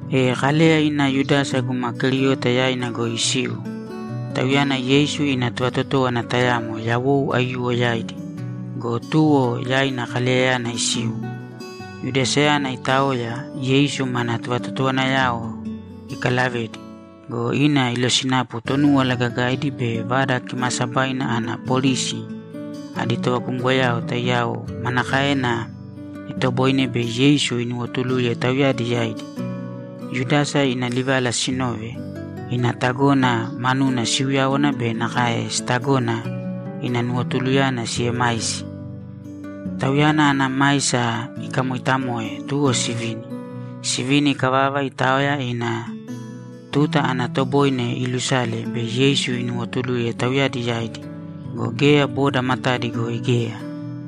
E Kaleya ina Yudasa guma Keriota yaina goi isiu. Tauyana Yeisu ina tovatotówana tayamo yawou aiyuwo yaidi go, tuwo yaina Kaleyayana isiu. Yudasayana itaoya, Yeisu mana tovatotowanayao ikalavedi go, ina ilosinapu Tonúwala Gagaidi be Vada Kimaasabaina ana polisi adi tovakumgoyao taiyao manakaena itoboine bei Yeisu inuwotuluye tauyadi yaidi. Yudasa ina livala sinove, ina tagona manuna siuyáwana be nakae sitagona ina nuwotuluyana siemaisi. Tauyana ana maisa ikamoitamoe, tuwo sivini. Sivini ikavava, itaoya ina tuta ana toboine iilusale bei Yeisu inuwotuluye tauyadi yaidi go, geya boda matadi goi geya.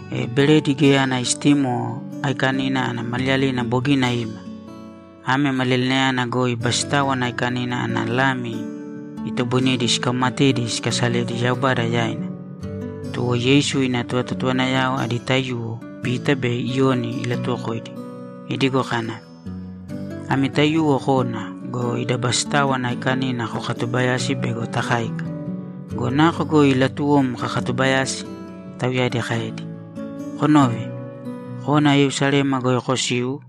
E Beredi Geya Ana Istimo Aikanina ana maliyalina bogina ima. Ame maliyalinayana goi Basitáwana Aikanina ana lami itoboinedi sikaumatedi sikasaledi Yaubada yaina. Tuwo Yeisu ina tovatotowanayao adi taiyuwo Pita be Iyoni ilatuwokoidi idigo kana, ‘Ami taiyuwo kōna go, ida Basitáwana Aikanina kokatubayāsi bego takáika.’ ‘Go nako goi latuwom kakatubayasi?’ tauyadi kaedi. ‘Konōve! Kōna Yerusalema goi kosīu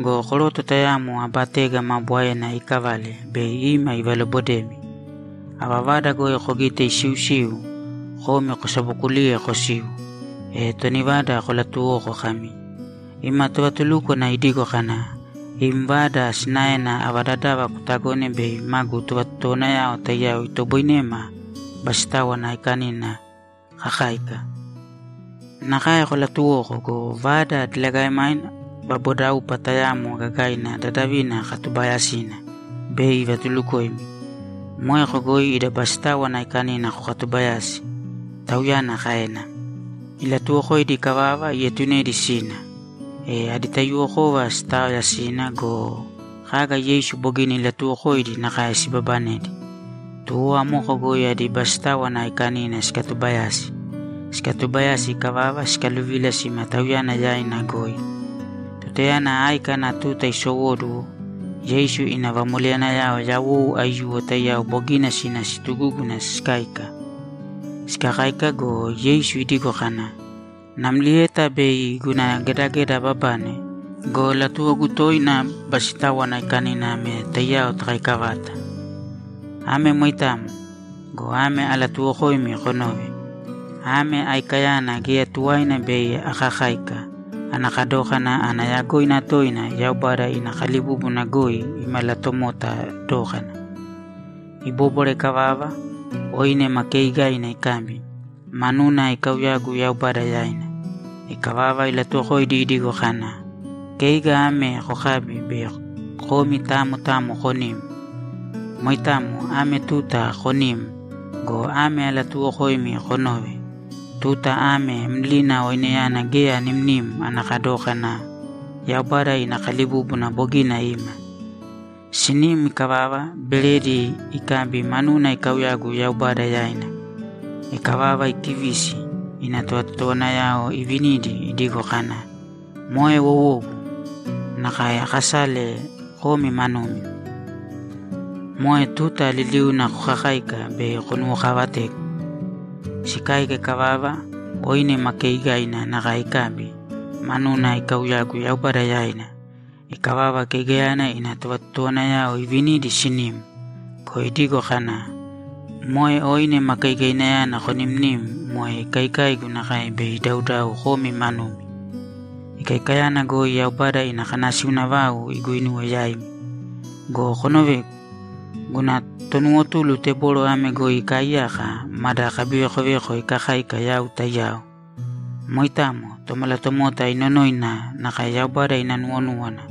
go, koroto tayamo aba tega maa bwaena iikavale bei ima ivalobodemi. Ava vada goi kogite isiusiu, komi kosabokulīye kosīu, e toni vada kolatuwōko kami, “Ima tovatulúkwana idigo kana, ‘Im vada sinaena ava dadava kutagone bei magu tovatotowanayao taiyao itoboinema Basitáwana Aikanina kakáika?’” Nakae kolatuwōko go, vada diligaemaina vabodaupa tayamo gagaina dadavina katubaayasina bei ivatulukoimi. Moeko goi ida Basitáwana Aikanina kokatubayāsi’, Tauyana kaena. Ilatuwokoidi ikavava, ietunedi sina. E adi taiyuwokova sitaoya sina go, kaga Yeisu bogina ilatuuwokoidi nakae sibabanedi. Tuwo amoko goi adi Basitáwana Aikanina sikatubayasi. Sikatubayasi ikavava, sikaluvila sima Tauyana yaina goi. Tutayana áika ana tuta isowóduwo, Yeisu ina vamoleyanayao yawou aiyuwo taiyao bogina sina situgúguna sikáika. Sikakáika go, Yeisu idigo kana, ‘Namlieta bei guna gedageda ababane go, latuwogu toina Basitáwana Aikanina ame taiyao takaika vata. Ame moitamo go, ame alatuuwokoimi konōve: Ame aikayana geya tuwaina bei akakáika ana kadókana ana yagoina toina Yaubada ina kalibúbuna goi imalatomota dókana.’ Ibóbwara ikavava, oine ma keigaina ikabi, manuna ikauyagu Yaubada yaina. Ikavava, ilatuwokoidi idigo kana, ‘Keiga ame kokābi be komi tamo tamo konīm. Moitamo ame tuta konīm go, ame alatuuwokoimi konōve: Tuta ame mlina oineyana geya animnim ana kadókana Yaubada ina kalibúbuna bogina ima.’ Sinim ikavava, beredi ikabi, manuna ikauyagu Yaubada yaina. Ikavava, ikivisi, ina tovatotowanayao ivinidi idigo kana, ‘Moe wowogu nakae aakasale komi manumi. Moe tuta liliuna kokakāika bei konuwokaavategu.’ Sikáika ikavava, oine ma keigaina nakae ikabi, manuna ikauyagu Yaubada yaina. Ikavava, keigayana ina tovatotowanayao ivinidi sinim go, idigo kana, ‘Moe oine ma keigainayana konimnim moe ikaikaigu nakae bei idaudau komi manumi. Ikaikayana goi Yaubada ina kanasiuna vau iguinuwe yaimi. Go konovēgu. Guna tonuwotulu teboro ame goi ikaaiyaka mada kabivekoveko ikakáika yau taiyao. Moitamo. Tomalatomota inonoina nakae Yaubada ina nuwonúwana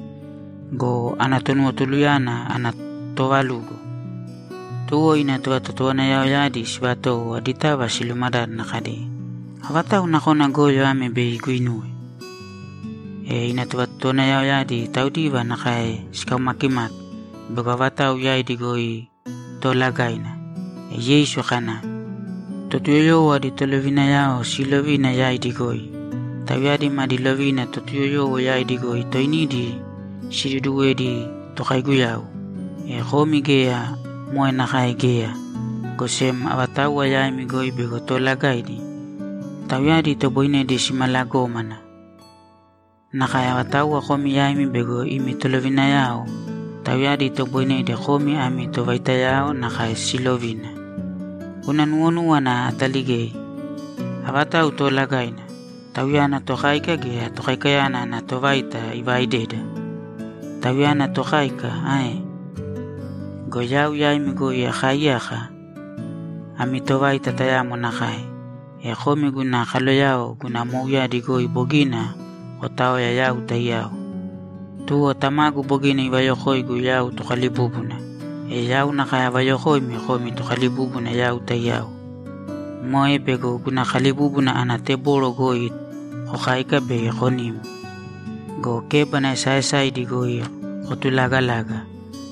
go, ana tonuwotuluyana ana toovalugo!’ Tuwo ina tovatotowanayaoyadi sivatowo aditava silumadádana kadi, ‘Avatau nakona goyo ame bei iguinuwe?’ E ina tovatotowanayaoyadi taudiva nakae sikaumakimaki bego avatau yaidi goi toolagaina. E Yeisu kana, ‘Totuyoyowo adi tolovinayao siilovina yaidi goi. Tauyadi maadi lovina Totuyoyowo yaidi goi toinidi siduduwedi tokaiguyau. E komi geya moe nakae geya, go sem avatauwa yaimi goi bego toolagaidi, tauyadi itoboinedi simalagómana. Nakae avatauwa komi yaimi bego imi tolovinayao, tauyadi itoboinedi komi ami tovaitayao nakae silovina. Guna nuwonúwana ataligei. Avatau toolagaina, tauyana tokáika gea tokaikayana ana tovaita ivaaideda? Tauyana tokáika ae? Go yau yaimi goi akaaiyaka ami tovaita tayamo nakae. E komi guna kaloyao guna mouyadi goi bogina kotaoya yau taiyao. Tuwo Tamagu bogina ivayokoigu yau Tokalibúbuna, e yau nakae avayokoimi komi tokalibúbuna yau taiyao. Moe bego guna kalibúbuna ana teboro goi kokáika be konim. Go kébana esaaesaidi goi kotulagalaga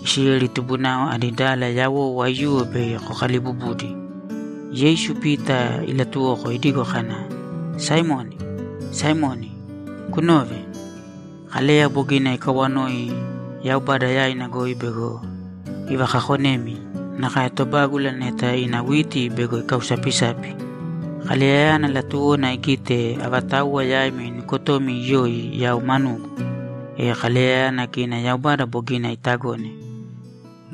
Isileli tubunao adi dala yawou aiyuwo bei kokalibubudi.’ Yeisu Pita ilatuwoko idigo kana, ‘Saimoni, Saimoni, kunōve. Kaleya bogina ikawanoi Yaubada yaina goi bego ivakakonemi nakae tobágula neta ina witi bego ikausapisapi. Kaleyayana latuwona igite avatauwa yaimi nukotomi iyoi yau manugu. E Kaleyayana kina Yaubada bogina itagone.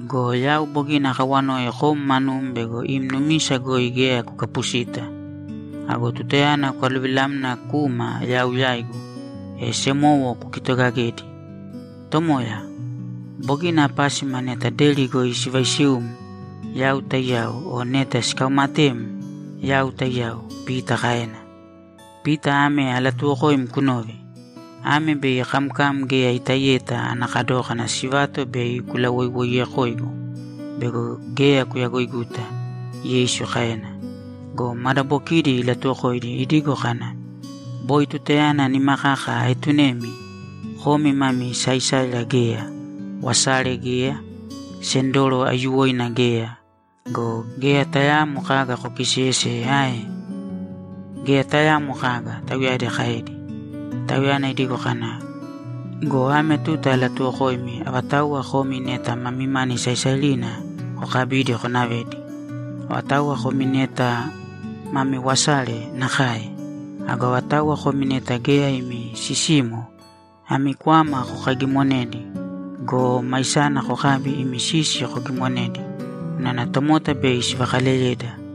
Go yau bogina akawanoi kom manum bego im numisa goi geya kukapusita. Ago tutayana kwaluvilamna kuma yau yaigu, e semowo kukitogagēdi.’ ‘Tomoya, bogina apásima neta deri goi sivaisium, yau taiyao o neta sikaumatem, yau taiyao’, Pita kaena. ‘Pita ame alatuuwokoim kunōve: Ame bei kamkam geya itaiyeta ana kadókana sivato bei kulawoiwoiyekoigu bego geya kuyagoiguta’, Yeisu kaena. Go madabokidi ilatuwokoidi idigo kana, ‘Boi tutayana nima kaka aetunemi, komi mani saisairina geya, wasare geya, sendoro aiyuwoina geya go, geya tayaamo kaga kokiseyeseye ae?’ ‘Geya tayaamo kaga’, tauyadi kaedi. Tauyana idigo kana, ‘Go ame tuta alatuwokoimi avatauwa komi neta mami mani saisairina, kokabīdi konavēdi. Avatauwa komi neta mami wasare, nakae. Ago avatauwa komi neta geya imi sisimo, ami kwama kokaigimonēdi go, maisana kokābi imi sisi kogimonēdi unana tomota bei sivakaleyeda.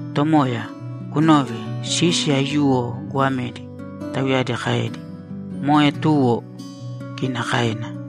‘Tomoya, kunōve. Sisi aiyuwo goamedi’, tauyadi kaedi. ‘Moe tuwo!’ kina kaena.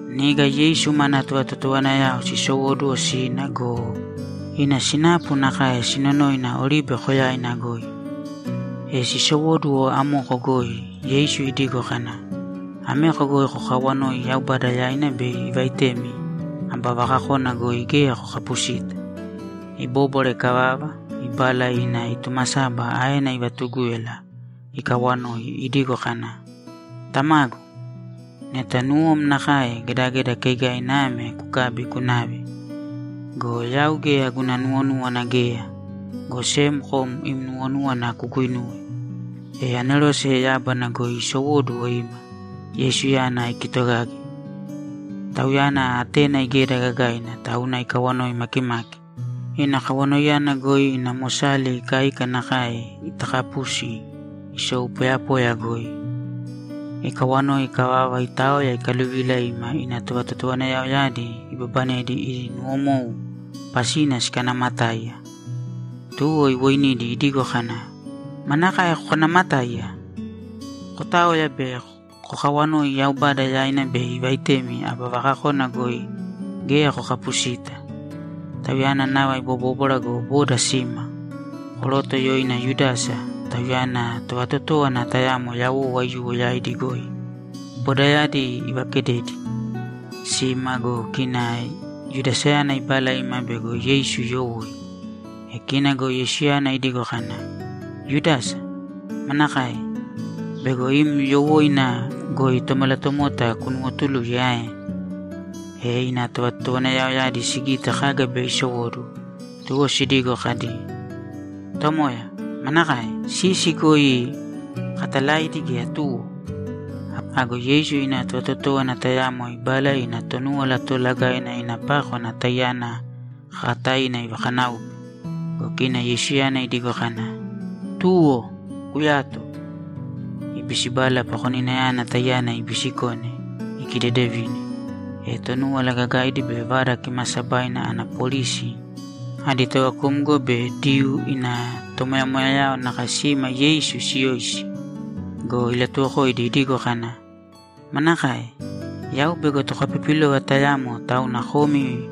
Niga Yeisu mana tovatotowanayao sisowóduwo sina go, ina sinapu nakae sinonoina Oribe Koyaina goi. E sisowóduwo amoko goi, Yeisu idigo kana, ‘Ameko kokawanōi Yaubada yaina bei ivaitemi aba vakakona goi geya kokapusita.’ Ibóbwara ikavava, ibala ina itumasaba aena ivatugúyala ikawanoi idigo kana, ‘Tamagu, neta nuwom nakae, gedageda keigaina ame kukābi kunāve. Go yau geya guna nuwonúwana geya, go sem kom im nuwonúwana kuguinūwe.’ [ E anerose yábana goi isowóduwo ima, Yeisuyana ikitogage.] Tauyana atena igeda gagaina, tauna ikawanoi makimaki. Ina kawanoiyana goi ina mosali ikaika nakae itakapusi isou poyapoya goi. Ikawanoi ikavava, itaoya ikaluvila ima ina tovatotowanayaoyadi ibabanedi idi nuwomou pasina sikanaamatáiya. Tuwo, iwoinidi idigo kana, ‘Manakae kokanaamatáiya? Kotāoya be kokawanōi Yaubada yaina bei ivaitemi aba vakakona goi geya kokapusita.’ Tauyana nava ibobóbwara go, boda sima. Koroto yoina Yudasa, tauyana tovatotówana tayamo yawou aiyuwo yaidi goi, bodayadi ivakededi. Sima go, kina Yudasayana ibala ima bego Yeisu iyowoi. E kina go Yeisuyana idigo kana, ‘Yudasa, manakae? Bego im yowóina goi Tomalatomota kunuwotuluye ae?’ E ina tovatotowanayaoyadi sigite kaga bei isowóduwo, tuwo sidigo kadi, ‘Tomoya, manakae? Sisi goi katalaidi gea tuwo?’ Ago Yeisu ina tovatotówana tayamo ibala ina Tonúwala Toolagaina ina pákwana taiyana kakataina ivakanáupe. Go kina Yeisuyana idigo kana, ‘Tuwo! Koyāto!’ Ibisibala pakoninayana taiyana ibisikone, ikidedevine. E Tonúwala Gagaidi be Vada Kimaasabaina ana polisi adi tovakumgo be Diyuu ina tomoyamoyayao nakae sima Yeisu siiyoisi go, ilatuwokoidi idigo kana, ‘Manakae? Yau bego tokapipilova tayamo, tauna komi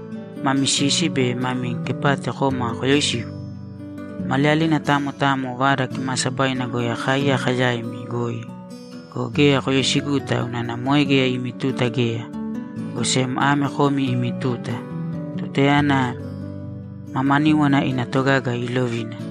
mami sisi be mami kepati koma koyoisigu? Maliyalina tamo tamo Vada Kimaasabaina goi akaaiyaka yaimi goi go, geya koyoisiguta unana moe geya imi tuta geya, go sem ame komi imi tuta, tutayana mamaníwana ina togaga iilovina.’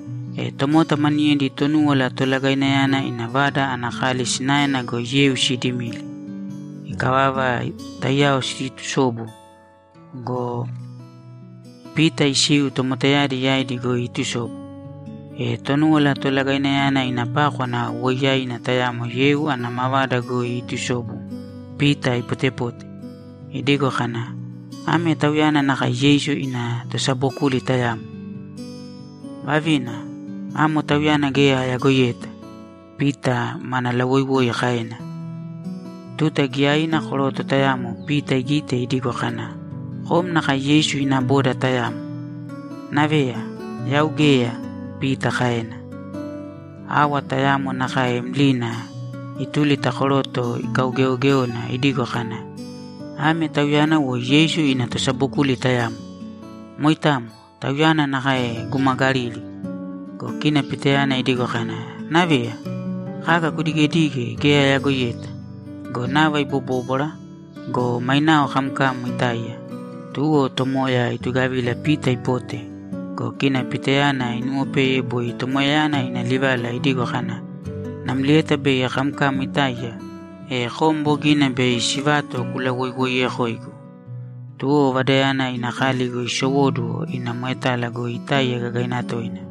E tomota maniyedi Tonúwala Tolagainayana ina vada ana kali sinaena goi yeu sidimili. Ikavava, taiyao siitusobu go, Pita isiu tomotayadi yaidi goi iitusobu. E Tonúwala Tolagainayana ina pákwana woiyaina tayamo yeu ana mavada goi iitusobu Pita ipotepote, idigo kana, ‘Ame tauyana nakae Yeisu ina tosabokuli tayamo.’ ‘Vavina, amo Tauyana geya ayagoiyeta!’ Pita mana lawoiwoi kaena. Tuta giyaina koroto tayamo Pita igite idigo kana, ‘Kom nakae Yeisu ina boda tayamo.’ ‘Naveya, yau geya!’ Pita kaena. Awa tayamo nakae mlina ituli ta koroto ikaugeogéona idigo kana, ‘Ame tauyana woi Yeisu ina tosabokuli tayamo. Moitamo. Tauyana nakae guma Galili.’ Go kina Pitayana idigo kana, ‘Naveya, kaga kudigedige geya ayagoiyeta.’ Go nava ibobóbwara go, mainao kamkam itáiya. Tuwo Tomoya itugavila Pita ipote go, kina Pitayana inuwopeye boi Tomoyayana ina livala idigo kana, ‘Namlieta bei kamkam itáiya, e kom bogina bei sivato kulawoiwoiyekoigu.’ Tuwo vadayana ina kali goi isowóduwo ina moetala goi itáiya gagaina toina.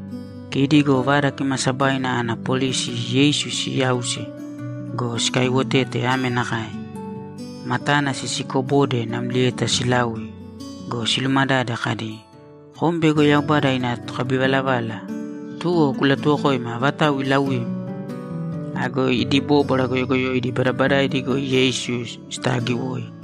Kidi go Vada Kimaasabaina ana polisi Yeisu siyause go, sikaiwotete ame nakae: Matana sisikobode namlieta silaui go, silumadade kadi, ‘Kom bego Yaubada ina tokabivalavala, tuwo kulatuwokōima avatau ilauim!’ Ago idi bóbwara goyogoyoidi badabadaidi goi Yeisu sitaagiwoi.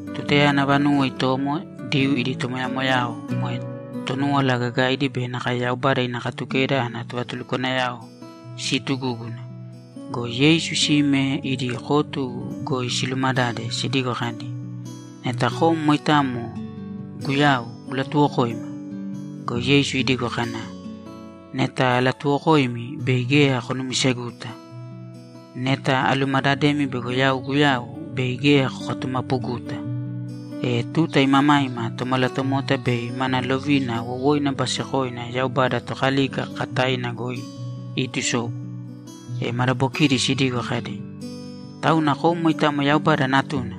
Tutayana vanuwo itomo, Diyuu idi tomoyamoyayao, moe Tonúwala Gagaidi be nakae Yaubada ina Katukeda ana tovatulukwanayao siitugúguna go, Yeisu sime idi kotu goi silumadade sidigo kadi, ‘Neta kom moitamo Guyau, kulatuwokōima!’ Go Yeisu idigo kana, ‘Neta alatuwokoimi, bei geya konumiseguta. Neta alumadademi bego yau Guyau, bei geya kokatumapuguta. E tuta imamaima Tomalatomota bei mana lovina wowoina basekoina Yaubada Tokalika kakataina goi iitusobu.’ E madabokidi sidigo kadi, ‘Tauna kom moitamo Yaubada Natuna?’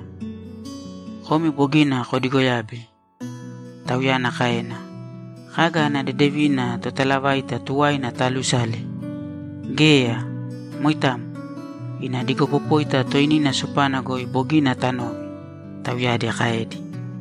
‘Komi bogina kodigoyabe’, Tauyana kaena. ‘Kaga ana dedevina totalavaita tuwaina taalusale? Geya! Moitamo. Ina digopopóita toinina sopana goi bogina tanove’, tauyadi kaedi.